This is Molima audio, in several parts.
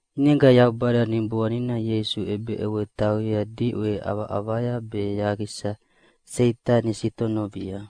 ʼInega Yaubada Niboanina Ieisu ʼebeʼewei tauyea diʼwe ʼavaʼavaya be yaqisa Seitani nasitonovia.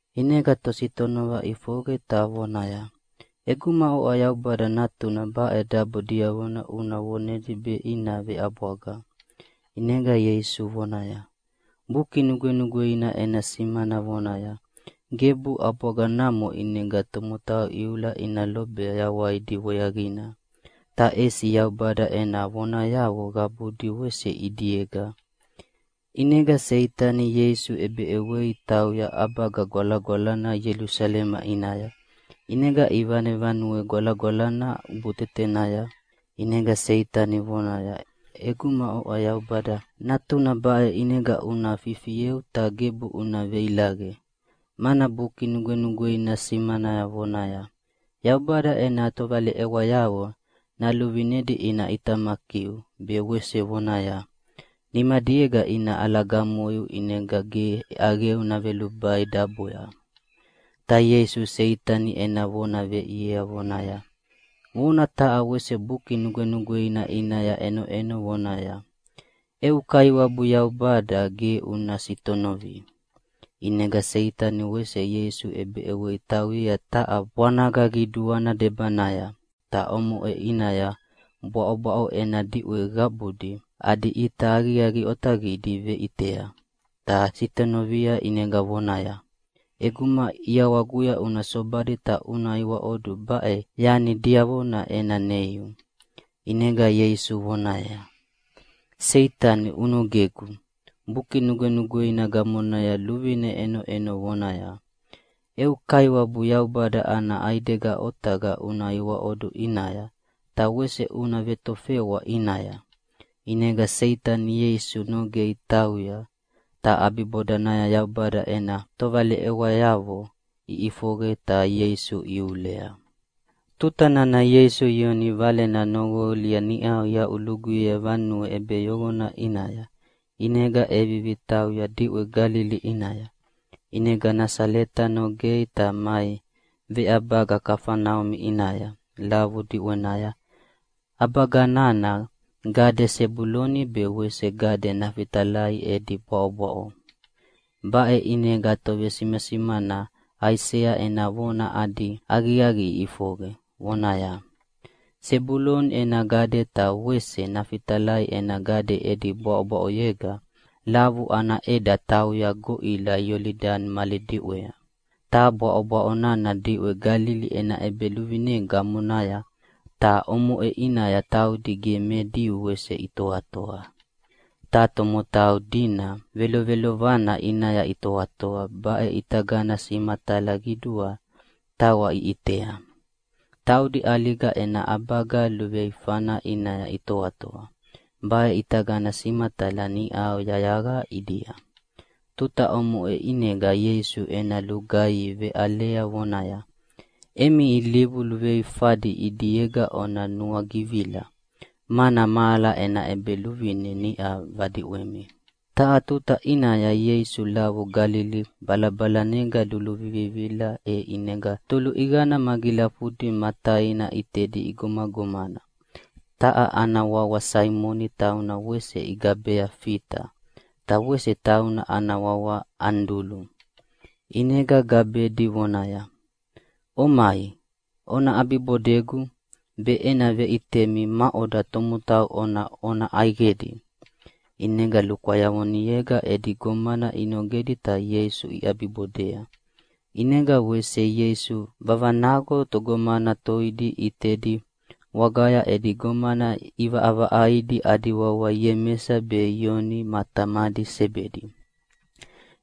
ʼInega tositonova ʼifoqe ta voneaya, “ʼEguma oʼa Yaubada Natuna baʼe dabo diavona una vonedi be ina veʼabwaga.” ʼInega Ieisu vonaya, “Buki Nugwenugweina ena simana vonaya, ‘Gebu ʼabwaga namo ʼinega tomotau iula ina lobei yawaidi weaqina, ta ʼesi Yaubada ena vonayavo qabudi wese ʼidiega.’” ʼInega Seitani Ieisu ʼebeʼewei tauyea ʼAbaga Gwalagwalana Ielusalema ʼinaya, ʼinega ivane Vanue Gwalagwalana ʼubutetenaya, ʼinega Seitani vonaya, “ʼEguma oʼa Yaubada Natuna baʼe ʼinega una fifieu ta gebu una veilaqe. Mana Buki Nugwenugweina simana vonaya, ‘Yaubada ena tovaleʼewayavo naluvinedi ina ʼitamakiu’, be wese vonaya, ‘Nimadiega ina ʼalagamoiu ʼinega ge ʼaqeu navelubai daboya.’” Ta Ieisu Seitani ena vona veʼiea vonaya, “Vona taha wese Buki Nugwenugweina ʼinaya ʼenoʼeno vonaya, ‘Eu Kaiwabu Yaubada ge una sitonovi!’” ʼInega Seitani wese Ieisu ʼebeʼewei tauyea taha bwanaga qiduana debanaya, ta omoʼe ʼinaya bwaʼobwaʼo ena diʼwe qabudi adi ʼita aqiaqi otaqidi veʼitea, ta sitonovia ʼinega voneaya, “ʼEguma ʼiawaguya una sobadi ta una iwaʼodu baʼe yani diavona ena neiu.” ʼInega Ieisu voneaya, “Seitani, unogegu! Buki Nugwenugweina gamonaya luvine ʼenoʼenova vonaya, ‘Eu Kaiwabu Yaubada ana ʼaidega otaqa una iwaʼodu ʼinaya, ta wese una vetofewa ʼinaya.’” ʼInega Seitani Ieisu nogei tauya, ta ʼabibodanaya Yaubada ena tovaleʼewayavo iʼifoqe ta Ieisu ihiulea. Tuta nana Ieisu Ioni valena noqolia niʼau iaʼuluguyea vanue ʼebeyoqona ʼinaya, ʼinega ʼevivi tauya diʼwe Galili ʼinaya. ʼInega Nasaleta nogei ta mai veʼabaga Kafaneumi ʼinaya, lavu diʼwenaya. ʼAbaga nana gade Sebuloni be wese gade Nafitalai edi bwaʼobwaʼo. Baʼe ʼinega tovesimasimana Aisea ena vona adi aqiaqi ʼifoqe, vonaya, “Sebuloni ena gade ta wese Nafitalai ena gade edi bwaʼobwaʼoyega lavu ana ʼeda tauya goʼila Iolidani mali diʼwea, ta bwaʼobwaʼo nana diʼwe Galili ena ʼebeluvine gamonaya, ta omoʼe ʼinaya taudi ge me Diu wese itoatoa. Ta tomotau dina velovelovana ʼinaya itoatoa baʼe ʼitagana simatala qiduana tawa iʼitea. Taudi ʼaliga ena ʼabaga luveifana ʼinaya itoatoa, baʼe ʼitagana simatala niʼau yayaqa ʼidia.” Tuta omoʼe ʼinega Ieisu ena lugaihi veʼalea vonaya, “Emi ilivu luveifadi ʼidiega ona nuagivila, mana mahala ena ʼEbeluvine niʼa vadiʼwemi!” Taha tuta ʼinaya Ieisu lavu Galili balabalanega luluvivila, e ʼinega toluʼiqana magilafudi ma taina ʼitedi igomagomana, taha ana wawa Saimoni tauna wese igabea Fita, ta wese taina ana wawa Anidulu. ʼInega gabedi vonaya, “Omai, ona ʼabibodegu, be ena veʼitemi maʼoda tomotau ona ʼona ʼaiqedi.” ʼInega lukwayavonega edi gomana inogedi ta Ieisu iʼabibodea. ʼInega wese Ieisu vavanaqo togomana toidi ʼitedi wagaya edi gomana iʼivaʼavaʼaidi adi wawa Iemesa be Ioni ma tamadi Sebedi.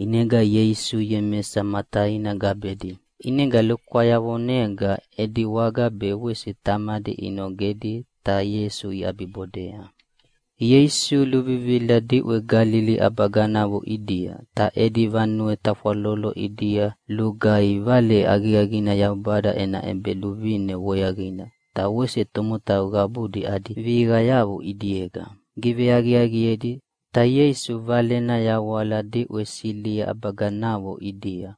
ʼInega Ieisu Iemesa ma taina gabedi, ʼinega lukwayavonega edi waga be wese tamadi inogedi, ta Ieisu iʼabibodea. Ieisu luvivila diʼwe Galili ʼabaganavo ʼidia, ta edi vanue tafwalolo ʼidia lugaihi Vale Aqiaqina Yaubada ena ʼEbeluvine weaqina, ta wese tomotau qabudi adi vihiqayavo ʼidiega giveaqiaqiedi. Ta Ieisu Valena yawala diʼwe Silia ʼabaganavo ʼidia.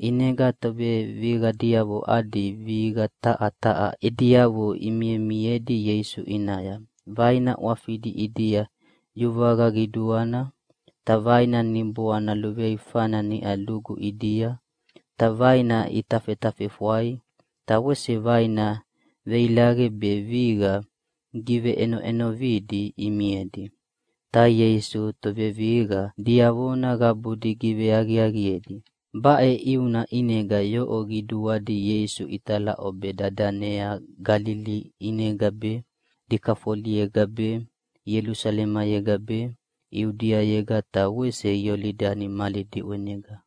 ʼInega tovevihiqayavo adi vihiqa taha taha ediavo imimiedi Ieisu ʼinaya. Vaina ʼwafidi ʼidia yuvaqa qiduana, ta vaina niboana luveifana niʼa lugu ʼidia, ta vaina itafetafefwai, ta wese vaina veilaqe be vihiqa giveʼenovidi imiedi. Ta Ieisu tovevihiqa diavona qabudi giveaqiaqiedi. Baʼe ʼiuna ʼinega yoʼo qiduadi Ieisu italaʼobe dadanea Galili ʼinega be, Dikafoliega be, Ielusalemega be, Iudiayega ta wese Iolidani mali diʼwenega.